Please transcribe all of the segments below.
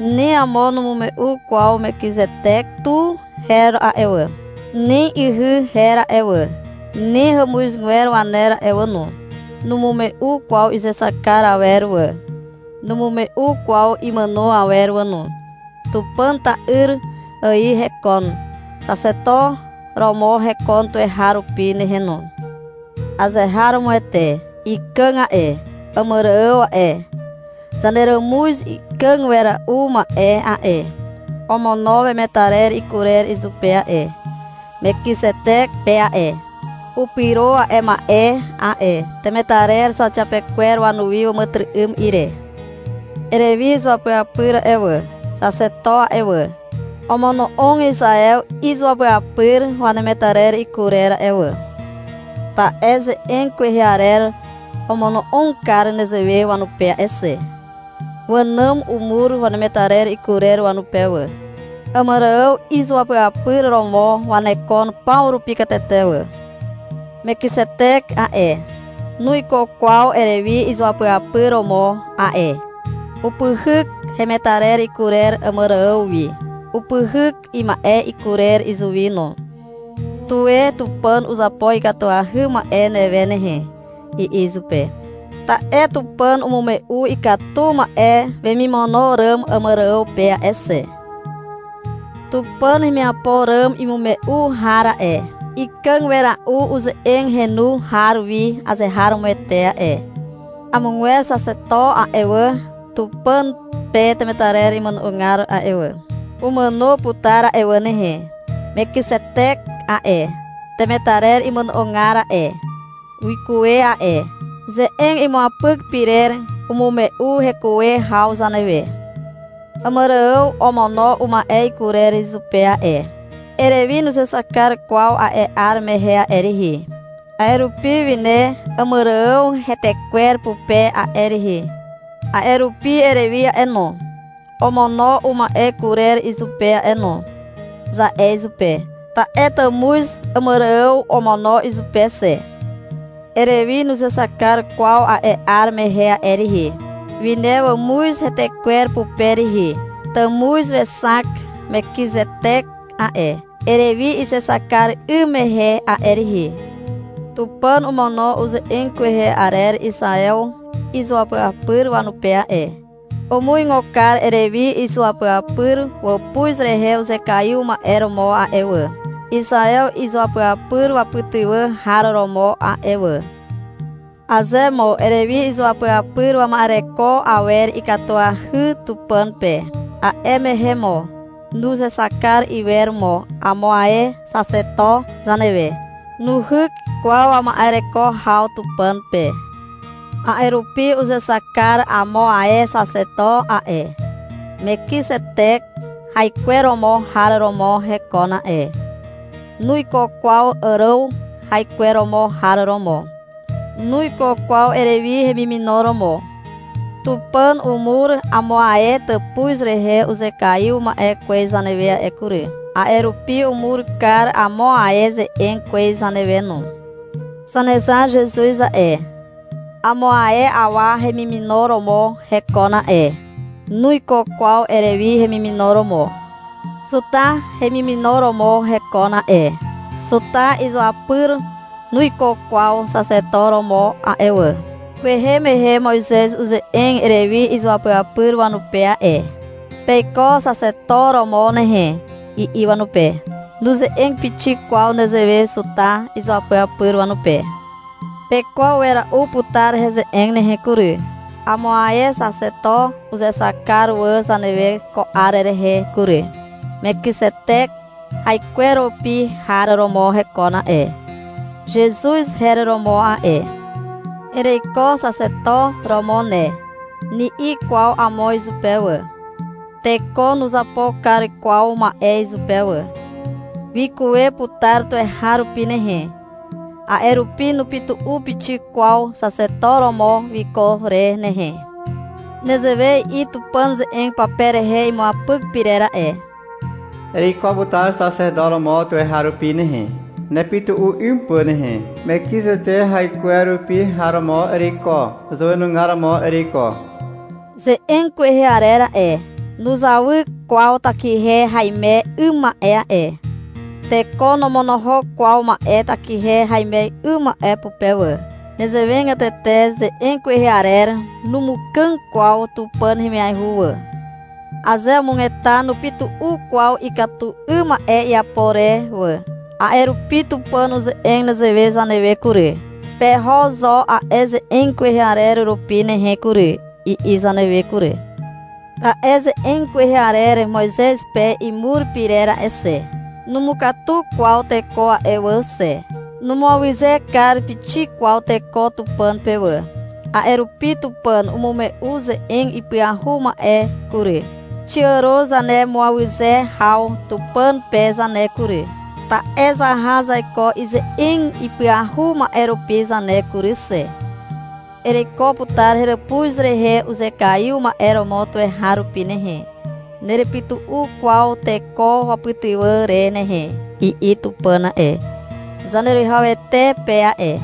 Ni amo numume'u kwaw Mekizetek tu her a'e wà, ni ihy her a'e wà, ni hàmuzgwer waner a'e wà no. Numume'u kwaw izexak kar awer wà. Numume'u kwaw imàno awer wà no. Tupàn ta'yr ài hekon. Xaxeto romo hekon tuweharupi nehe no. Azeharomoete ikàg a'e. Àmàrààw a'e, zaneràmuz ikàg wera'u ma'e a'e, omono wemetarer ikurer izupe a'e, Mekizetek pe a'e. (Upyro a'e ma'e a'e temetarer zauxiapekwer wanuwi, wàmàtyry'ym ire.) Erewi izuapyapyr a'e wà, Xaxeto a'e wà, omono'og Izaew izuapyapyr wanemetarer ikurer a'e wà, ta'e ze'eg kwehe arer omono'og kar nezewe wanupe a'e xe. Wànàm umur wemetarer ikurer wanupe wà. Àmàrààw izuapyapyr romo wanekon paw rupi katete wà. Mekizetek a'e, nuiko kwaw Erewi izuapyapyr romo a'e. Upyhyk hemetarer ikurer Àmàrààw wi, upyhyk ima'e kurer izuwi no. — Tuwe Tupàn uzapo ikatuahy ma'e newe nehe, i'i izupe, ta'e Tupàn umume'u ikatu ma'e wemimono ràm Àmàrààw pe a'e xe. Tupàn hemiapo ràm imume'u har a'e, ikàg wera'u uze'eg henu har wi azeharomoete a'e. Amogwer xaxeto a'e wà, Tupàn pe temetarer imono'ogar a'e wà, umàno putar a'e wà nehe. Mekizetek a'e, temetarer imono'ogar a'e, wikuwe a'e. Ze'eg imuapyk pyrer umume'u hekuwe haw zanewe. Àmàrààw omono uma'e ikurer izupe a'e. (Erewi nuzexak kar kwaw a'e 'ar mehe a'e rihi. A'e rupi wine Àmàrààw hetekwer pupe a'e rihi.) A'e rupi — Erewi a'e no, omono uma'e kurer izupe a'e no, za'e izupe. Ta'e tàmuz Àmàrààw omono izupe xe. Erewi nuzexak kar kwaw a'e 'ar mehe a'e rihi. Wine wàmuz hetekwer pupe rihi. Tàmuz wexak Mekizetek a'e, Erewi izexak kar 'ym mehe a'e rihi. Tupàn omono uze'eg kwehe arer Izaew izuapyapyr wanupe a'e. Umuigo kar Erewi izuapyapyr wàpuz rehe uzekaiw ma'e romo a'e wà, Izaew izuapyapyr wapytywà har romo a'e wà. Aze mo Erewi izuapyapyr wama'ereko awer ikatuahy Tupàn pe, a'e mehe mo nuzexak kar iwer mo amo ae xaxeto zanewe. Nuhyk kwaw wama'ereko haw Tupàn pe. A'e rupi uzexak kar amo ae xaxeto a'e. Mekizetek haikweromo har romo hekon a'e. Nuiko kwaw Àràw haikweromo har romo. (Nuiko kwaw Erewi hemimino romo.) Tupàn umur amo ae tàpuz rehe uzekaiw ma'e kwez zanewe a'e kury. A'e rupi umur kar amo ae ze'eg kwez zanewe no. Zanezar Zezuz a'e, amo ae awa hemimino romo hekon a'e. Nuiko kwaw Erewi hemimino romo. Zuta hemimino romo hekon a'e. Zuta izuapyr nuiko kwaw xaxeto romo a'e wà. Kwehe mehe Moizez uze'eg Erewi izuapyapyr wanupe a'e. — Peiko Xaxeto romo nehe, i'i wanupe. Nuze'eg pixik kwaw nezewe Zuta izuapyapyr wanupe. Pekwaw wera'u putar heze'eg nehe kury. Amo ae xaxeto uzexak kar wà zanewe ko 'ar rehe kury. Mekizetek haikwerupi har romo hekon a'e. (Zezuz her romo a'e.) — Ereiko xaxeto romo ne, ni'i kwaw amo izupe wà. Teko nuzapo kar kwaw ma'e izupe wà. Wikuwe putar tuweharupi nehe. A'e rupi nupytu'u pixik kwaw xaxeto romo wiko re nehe. Nezewe i'i Tupàn ze'eg pape rehe imuapyk pyrer a'e. — Ereiko putar xaxeto romo tuweharupi nehe, nepytu'u 'ym pà nehe. Mekizetek haikwerupi har romo ereiko. Izàwenugar romo ereiko. Ze'eg kwehe arer a'e, nuzawy kwaw takihe haime 'ym ma'e a'e. Teko nomonohok kwaw ma'e takihe haime 'ym ma'e pupe wà. Nezewegatete ze'eg kwehe arer numukàg kwaw Tupàn hemiaihu wà. Aze umugeta nupytu'u kwaw ikatu 'ym ma'e iapo re wà. A'e rupi Tupàn uze'eg nezewe zanewe kury. — Peho zo a'e ze'eg kwehe arer rupi nehe kury, i'i zanewe kury. Ta'e ze'eg kwehe arer Moizez pe imur pyrer a'e xe, numukatu kwaw teko a'e wà xe. Numuawyze kar pixik kwaw teko Tupàn pe wà. A'e rupi Tupàn umume'u ze'eg ipyahu ma'e kury. Xiàro zanemuawyze haw Tupàn pe zane kury, ta'e zaha zaiko ize'eg ipyahu ma'e rupi zane kury xe. — Ereiko putar heràpuz rehe uzekaiw ma'e romo tuweharupi nehe, nerepytu'u kwaw teko wapytywà re nehe, i'i Tupàn a'e, Zaneruwihawete pe a'e.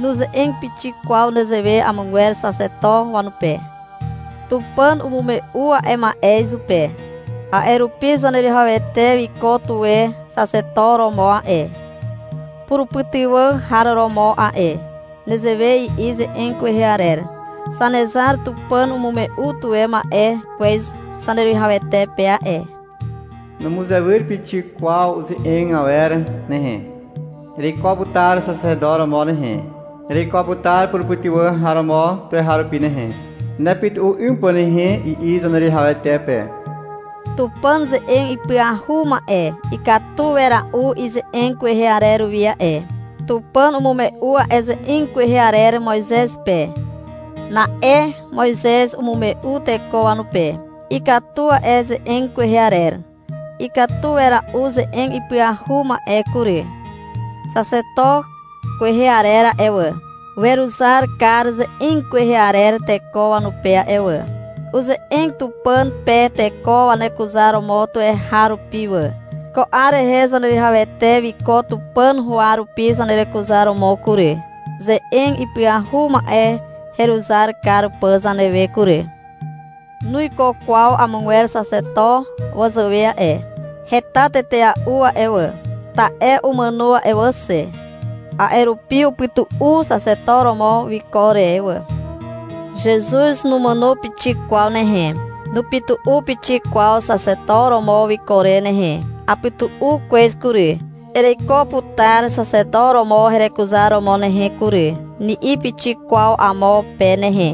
Nuze'eg pixik kwaw nezewe amogwer xaxeto wanupe. Tupàn umume'u a'e ma'e izupe. A'e rupi Zaneruwihawete wiko tuwe xaxeto romo a'e, purupytywà har romo a'e. Nezewe i'i ze'eg kwehe arer. — Zanezar Tupàn umume'u tuwe ma'e kwez Zaneruwihawete pe a'e. Numuzewyr pixik kwaw uze'eg awer nehe. Ereiko putar xaxeto romo nehe, ereiko putar purupytywà har romo tuweharupi nehe, nepytu'u 'ym pà nehe, i'i Zaneruwihawete pe. Tupàn ze'eg ipyahu ma'e ikatu wera'u ize'eg kwehe arer wi a'e. Tupàn umume'u a'e ze'eg kwehe arer Moizez pe. Na'e Moizez umume'u teko wanupe. Ikatu a'e ze'eg kwehe arer. Ikatu wera'u ze'eg ipyahu ma'e kury. Xaxeto kwehe arer a'e wà, weruzar kar ze'eg kwehe arer teko wanupe a'e wà. Uze'eg Tupàn pe teko wanekuzaromo tuweharupi wà. Ko 'ar rehe Zaneruwihawete wiko Tupàn huwa rupi zanerekuzaromo kury, ze'eg ipyahu ma'e heruzar kar pà zanewe kury. Nuiko kwaw amogwer xaxeto wazàwe a'e. Heta tetea'u a'e wà, ta'e umàno a'e wà xe. A'e rupi upytu'u xaxeto romo wiko re wà. Zezuz numàno pixik kwaw nehe. Nupytu'u pixik kwaw xaxeto romo wiko re nehe. — Apytu'u kwez kury, ereiko putar xaxeto romo herekuzar romo nehe kury, ni'i pixik kwaw amo pe nehe.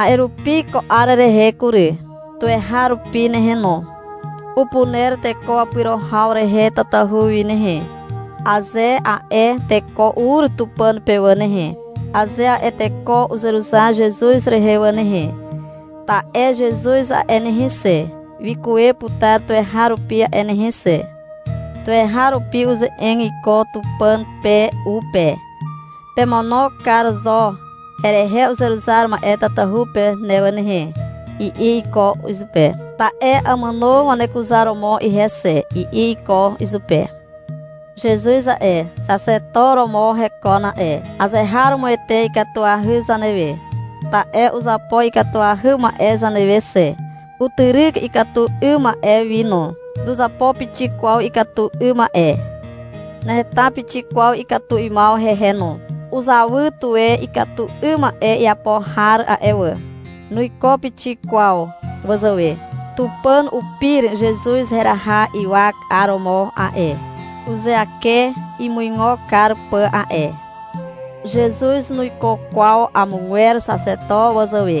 A'e rupi ko 'ar rehe kury, tuweharupi nehe no, upuner teko wapyro haw rehe tatahu wi nehe, aze a'e teko ur Tupàn pe wà nehe, aze a'e teko uzeruzar Zezuz rehe wà nehe. Ta'e Zezuz a'e nehe xe, wikuwe putar tuweharupi a'e nehe xe. Tuweharupi uze'eg iko Tupàn pe u pe. — Pemono kar zo herehe uzeruzar ma'e tatahu pe ne wà nehe, i'i iko izupe. — Ta'e amàno wanekuzaromo ihe xe, i'i iko izupe. Zezuz a'e, xaxeto romo hekon a'e. Azeharomoete ikatuahy zanewe, ta'e uzapo ikatuahy ma'e zanewe xe. Utyryk ikatu 'ym ma'e wi no. Nuzapo pixik kwaw ikatu 'ym ma'e. Naheta pixik kwaw ikatu 'ymaw hehe no. Uzawy tuwe ikatu 'ym ma'e iapo har a'e wà. Nuiko pixik kwaw wazàwe. Tupàn upir Zezuz heraha ywak 'aromo a'e, (uzeake imuigo kar pà a'e). Zezuz nuiko kwaw amogwer xaxeto wazàwe.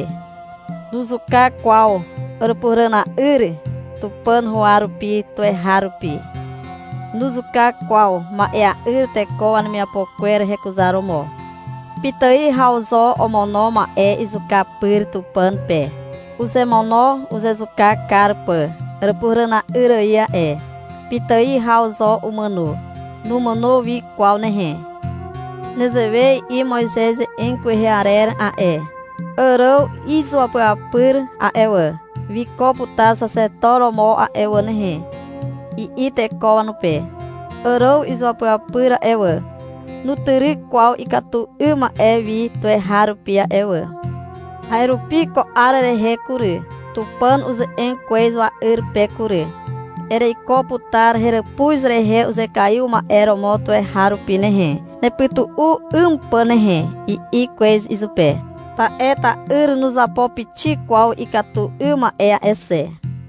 Nuzuka kwaw Àràpuhàràna'yr Tupàn huwa rupi tuweharupi. Nuzuka kwaw ma'ea'yr teko wanemiapo kwer hekuzaromo. Pitài haw zo omono ma'e izuka pyr Tupàn pe. Uzemono uzezuka kar pà Àràpuhàràna'yr ài a'e. Pitài haw zo umàno. Numàno wi kwaw nehe. Nezewe i'i Moizez ze'eg kwehe arer a'e. — Àràw izuapyapyr a'e wà, wiko putar xaxeto romo a'e wà nehe, i'i teko wanupe. Àràw izuapyapyr a'e wà, nutyryk kwaw ikatu 'ym ma'e wi tuweharupi a'e wà. A'e rupi ko 'ar rehe kury, Tupàn uze'eg kwez wa'yr pe kury. — Ereiko putar heràpuz rehe uzekaiw ma'e romo tuweharupi nehe, nepytu'u 'ym pà nehe, i'i kwez izupe. Ta'e ta'yr nuzapo pixik kwaw ikatu 'ym ma'e a'e xe.